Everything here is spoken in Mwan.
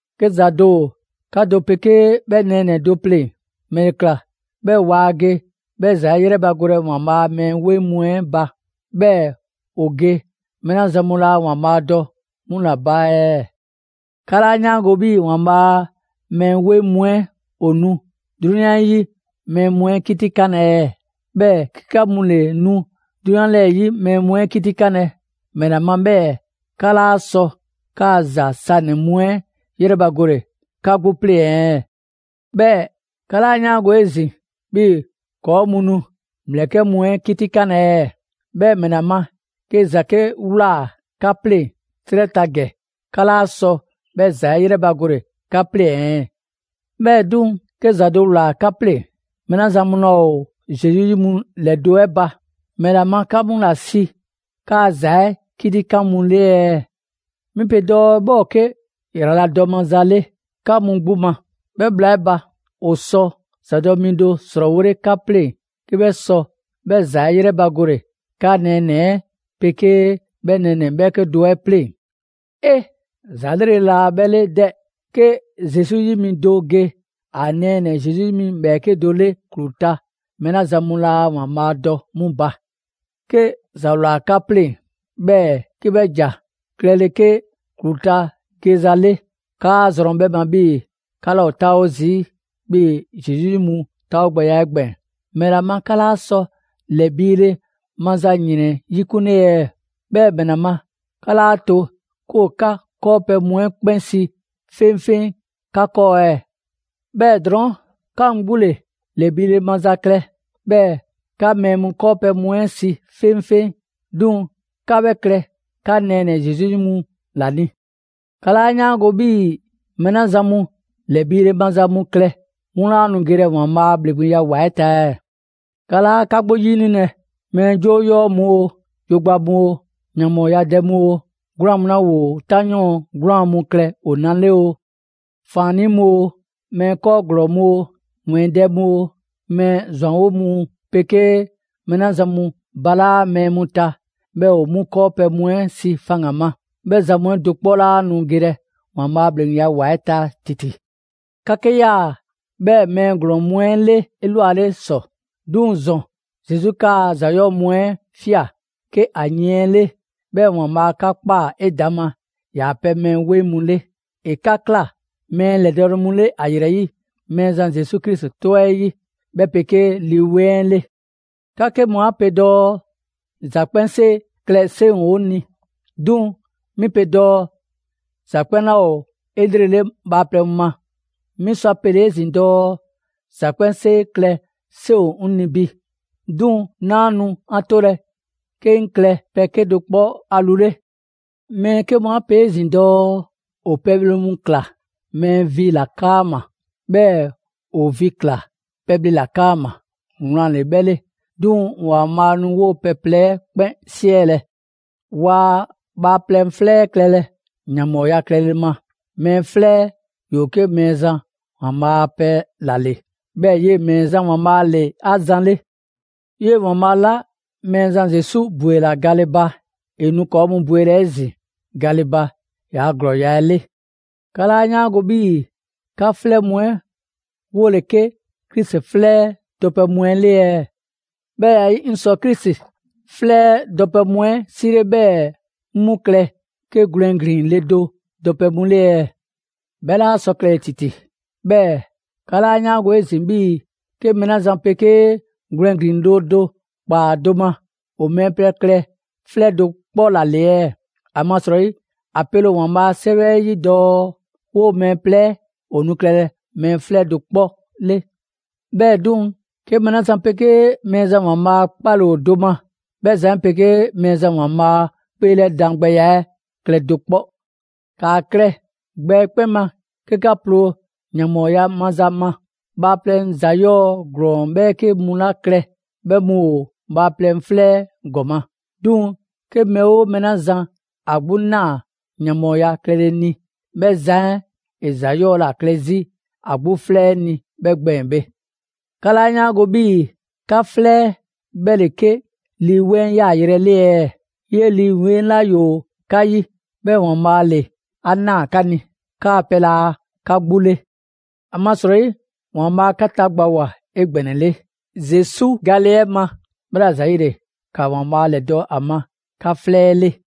'Ke ‑za do ‑o 'ka do 'pegee 'bhɛ nɛɛnɛ‑ do 'pleŋ‑, ‑mɛle ‑kla 'bhɛɛ‑ waa ge 'bhɛ ‑za 'ɛ 'yrɛbagolɛ ‑Waanbhaa' a mɛɛ 'weŋ mu 'ɛ ba; 'bhɛɛ‑ ‑o ge mɛɛ 'la zan mu laa ‑Waanbhaa' dɔ 'mu ‑la ba ɛɛ? 'Ka 'laa 'yaango‑ 'bhii‑ ‑Waanbhaa' a mɛɛ 'weŋ mu 'ɛ ‑o nu 'drunyan 'yi mɛɛ mu 'ɛ 'kitikanlɛ ɛɛ? 'Bhɛɛ‑ 'ke 'ka mu ‑le nu 'drunyan 'lɛɛ‑ 'yi mɛɛ mu 'ɛ 'kitikanlɛ, ‑mɛla ma 'bhɛɛ‑ 'ka 'laa sɔ 'kaa‑ ‑za sanɛ‑ mu 'ɛ 'yrɛbagole 'ka 'gbu 'pleŋ‑ ɛɛ? 'Bhɛɛ‑ 'ka 'laa 'yaango‑ 'ezin‑ 'bhii‑ ‑kɔɔ' mu nu ‑mlɛkɛ' mu 'ɛ 'kitikanlɛ ɛɛ? 'Bhɛɛ‑ ‑mɛla ma 'ke ‑za 'ke ꞊wlaa 'ka 'pleŋ‑ 'trɛ ta ‑gɛ, 'ka 'laa sɔ 'bhɛ ‑za 'ɛ 'yrɛbagole 'ka 'pleŋ‑ ɛɛ? 'Bhɛɛ‑ 'duŋ‑, 'ke ‑za do ‑wlaa 'ka 'pleŋ‑, mɛɛ 'la zan mu laa ‑o Zesu 'yi mu ‑lɛdo' 'ɛ ba, ‑mɛla ma 'ka mu ‑la si 'kaa‑ ‑za 'ɛ 'kitikan mu 'le ɛɛ? 'Mi pe dɔɔ 'bhɛ ‑o 'ke ‑yraladɔ maza 'le 'ka mu 'gbu ma. 'Bhɛ bhla 'ɛ ba, ‑o sɔ ‑zadɔ' mi do ‑srɔɔwole 'ka pleŋ 'ke 'bhɛ sɔ 'bhɛ ‑za 'ɛ 'yrɛbagole 'ka nɛɛnɛ‑ 'ɛ 'pegee 'bhɛ nɛɛnɛ‑ 'bhɛɛke do 'ɛ 'pleŋ‑. 'E! ‑Za 'lrele‑ laa 'bhɛ 'le 'dɛ! 'Ke Zesu 'yi mi do ge ‑a nɛɛnɛ‑ Zesu 'yi ‑bhɛɛke' do 'le ‑klu ta mɛɛ 'la zan mu laa ‑Waanbhaa' dɔ 'mu ba. 'Ke ‑za ‑wlaa 'ka 'pleŋ‑, 'bhɛɛ‑ 'ke 'bhɛ ‑ja klɛlɛ 'ke ‑klu ta geza 'le; 'kaa zrɔn 'bhɛ ma 'bhii‑ 'ka 'laa ‑o 'taawo zii' 'bhii‑ Zesu 'yi mu 'taawogbɛya 'ɛ gbɛɛn‑. ‑Mɛla ma 'ka 'laa sɔ ‑lɛbiile maza ‑yrɛn 'yikunle ɛɛ? 'Bhɛɛ‑ ‑mɛla ma 'ka 'laa to 'ke ‑o 'ka 'kɔɔpɛ‑ mu 'ɛ 'kpɛn si 'feŋfeŋ 'ka 'kɔɔ ɛɛ? 'Bhɛɛ‑ drɔɔn', 'ka mu 'gbu ‑le ‑lɛbiile maza klɛ, 'bhɛɛ‑ 'ka mɛɛ mu 'kɔɔpɛ‑ mu 'ɛ si 'feŋfeŋ; 'duŋ‑ 'ka 'bhɛ klɛ 'ka nɛɛnɛ‑ Zesu 'yi mu ‑la ni. 'Ka 'laa 'yaango‑ 'bhii‑ mɛɛ 'la zan mu ‑lɛbiile maza mu klɛ, 'mu laa nu gelɛ ‑Waanbhaa' a ‑bhleŋgbeya ‑wa 'ɛ ta ɛɛ? 'Ka 'laa 'ka 'gbu 'yinilɛ: mɛɛ 'joo 'yɔɔ‑ mu oo, yogba mu oo, ‑yanbhɔɔyadɛ mu oo, 'gwlaan‑ mu 'la ‑woo 'tanyɔɔn 'gwlaan‑ klɛ ‑o na 'le oo, ‑faannii' mu oo, mɛɛ 'kɔɔ ‑glɔɔ mu oo, ‑wɛɛndɛ' mu oo, mɛɛ ‑zwanwo' mu 'pegee mɛɛ 'la zan mu balaa' mɛɛ mu ta 'bhɛɛ‑ ‑o 'mu 'kɔɔpɛ‑ mu 'ɛ si faŋgan‑ ma. 'Bhɛ zan mu 'ɛ do 'kpɔ 'laa nu gelɛ ‑Waanbhaa' a ‑bhleŋgbeya ‑wa 'ɛ ta ‑titi. 'Ka 'ke 'yaa‑ 'bhɛɛ mɛɛ ‑glɔɔn mu 'ɛ 'le 'elwale ‑sɔ. 'Duŋ‑ ‑zɔn, Zesu 'kaa‑ ‑za 'yɔɔ‑ mu 'ɛ ꞊fia 'ke ‑a yiɛn 'le, 'bhɛɛ‑ ‑Waanbhaa' 'ka ꞊kpaa 'edaŋma ‑yaa' pɛ mɛɛ 'weŋ mu 'le. ‑E 'ka ꞊kla mɛɛ ‑lɛdɔɔle mu 'le ‑a ‑yrɛ 'yi Mɛɛzan Zesu Krisi 'tɔ 'ɛ 'yi, 'bhɛ 'pegee Lii 'Weŋ 'ɛ 'le. 'Ka 'ke mu 'a pe dɔɔ: «‑Za 'kpɛnsee klɛ 'seŋ 'o ni». 'Duŋ‑ 'mi pe dɔɔ ‑za 'kpɛn 'laa ‑o 'elrele bhaaplɛŋ ma. 'Mi sɔ ‑a pele‑ 'ezin‑ dɔɔ: «‑Za 'kpɛnsee klɛ 'seŋ ‑o 'ŋ 'ni bi». 'Duŋ‑ 'naa nu a 'tolɛ‑ 'ke 'ŋ klɛ pɛ 'kedo‑ 'kpɔ a lu 'le. Mɛɛ 'ke mu 'a pe 'ezin‑ dɔɔ: «‑O pɛbhle mu ꞊kla mɛɛ vi ‑la 'kaama‑, 'bhɛɛ‑ ‑o vi ꞊kla pɛbhle ‑la 'kaama‑». Wlan ‑le 'bhɛ 'le, 'duŋ‑ ‑Waanbhaa' nu 'woo‑ pɛ plɛ 'ɛ 'kpɛn 'siɛlɛ‑. Waa bhaaplɛŋ 'flɛ 'ɛ klɛlɛ ‑yanbhɔɔya klɛle 'kaama. Mɛɛ 'flɛ 'ɛ ‑yoo 'ke Mɛɛzan ‑Waanbhaa' a pɛ ‑la ‑le, 'bhɛɛ‑ 'yee‑ Mɛɛzan ‑Waanbhaa' ‑le 'a zan 'le. 'Yee‑ ‑Waanbhaa' 'la Mɛɛzan Zesu ‑bwela gale ba, ‑e nu ‑kɔɔ' mu bwelɛ 'ezin‑ gale ba ‑yaa' ‑glɔɔla 'ɛ 'le. 'Ka 'laa 'yaango‑ 'bhii‑ 'ka 'flɛ mu 'ɛ 'wole‑ 'ke Krisi 'flɛ 'ɛ dɔpɛ mu 'le ɛɛ? 'Bhɛ ya 'ɛ 'yi, 'ŋ sɔ Krisi 'flɛ 'ɛ dɔpɛ mu 'ɛ 'sile 'bhɛɛ‑ 'ŋ 'mu klɛ 'ke gwlɛn ‑glin ‑le do dɔpɛ mu 'le ɛɛ? 'Bhɛ 'laa sɔ klɛle‑ ‑titi! 'Bhɛɛ‑ 'ka 'laa 'yaango‑ 'ezin‑ 'bhii‑ 'ke mɛɛ 'la zan 'pegee gwlɛn ‑glin le do ‑kpaa do ma, ‑o mɛɛ plɛ klɛ 'flɛ do 'kpɔ ‑la ‑le ɛɛ? ‑Amasrɔyi ‑a pele ‑o ‑Waanbhaa' a 'Sɛwɛ 'ɛ 'yi dɔɔ: «'Woo‑ mɛɛ plɛ 'ɛ ‑o nu klɛlɛ mɛɛ 'flɛ do 'kpɔ 'le.» 'Bhɛɛ‑ 'duŋ‑, 'ke mɛɛ 'la zan 'pegee Mɛɛzan ‑Waanbhaa' 'kpale‑ ‑o do ma, 'bhɛ zan 'ɛ 'pegee Mɛɛzan ‑Waanbhaa' 'kpeelɛdan gbɛya 'ɛ klɛ do 'kpɔ. ‑Kaa klɛ gbɛ 'ɛ 'kpɛn ma 'ke 'ka ploo ‑yanbhɔɔya maza ma! Bhaaplɛŋ ‑za 'yɔɔ‑ ‑glɔɔn 'bhɛɛke mu 'la klɛ, 'bhɛ mu ‑o bhaaplɛŋ 'flɛ 'ɛ ‑gɔma'. 'Duŋ‑ 'ke mɛɛ 'oo mɛɛ 'la zan ‑a 'gbu ꞊naa ‑yanbhɔɔya klɛle ni, 'bhɛ zan 'ɛ ‑e ‑za 'yɔɔ‑ ‑la klɛ 'zi ‑a 'gbu 'flɛ 'ɛ ni 'bhɛɛ gbɛɛn‑ bhe. 'Ka 'laa 'yaango‑ 'bhii‑ 'ka 'flɛ 'ɛ 'bhɛ ‑le 'ke Lii 'Weŋ 'ɛ yaayrɛ 'ɛ 'le ɛɛ? 'Yee‑ Lii 'Weŋ 'la ‑yoo 'ka 'yi; 'bhɛɛ‑ ‑Waanbhaa' ‑le 'a ꞊naa 'ka ni. 'Kaa‑ pɛ laa 'ka 'gbu 'le. ‑Amasrɔyi ‑Waanbhaa' 'ka tagbawoa 'egbɛnɛle, Zesu gale 'ɛ ma. 'Bhɛla‑ ‑zayile, ‑ka ‑Waanbhaa' ‑lɛdɔ' ‑a ma 'ka 'flɛ 'ɛ 'le.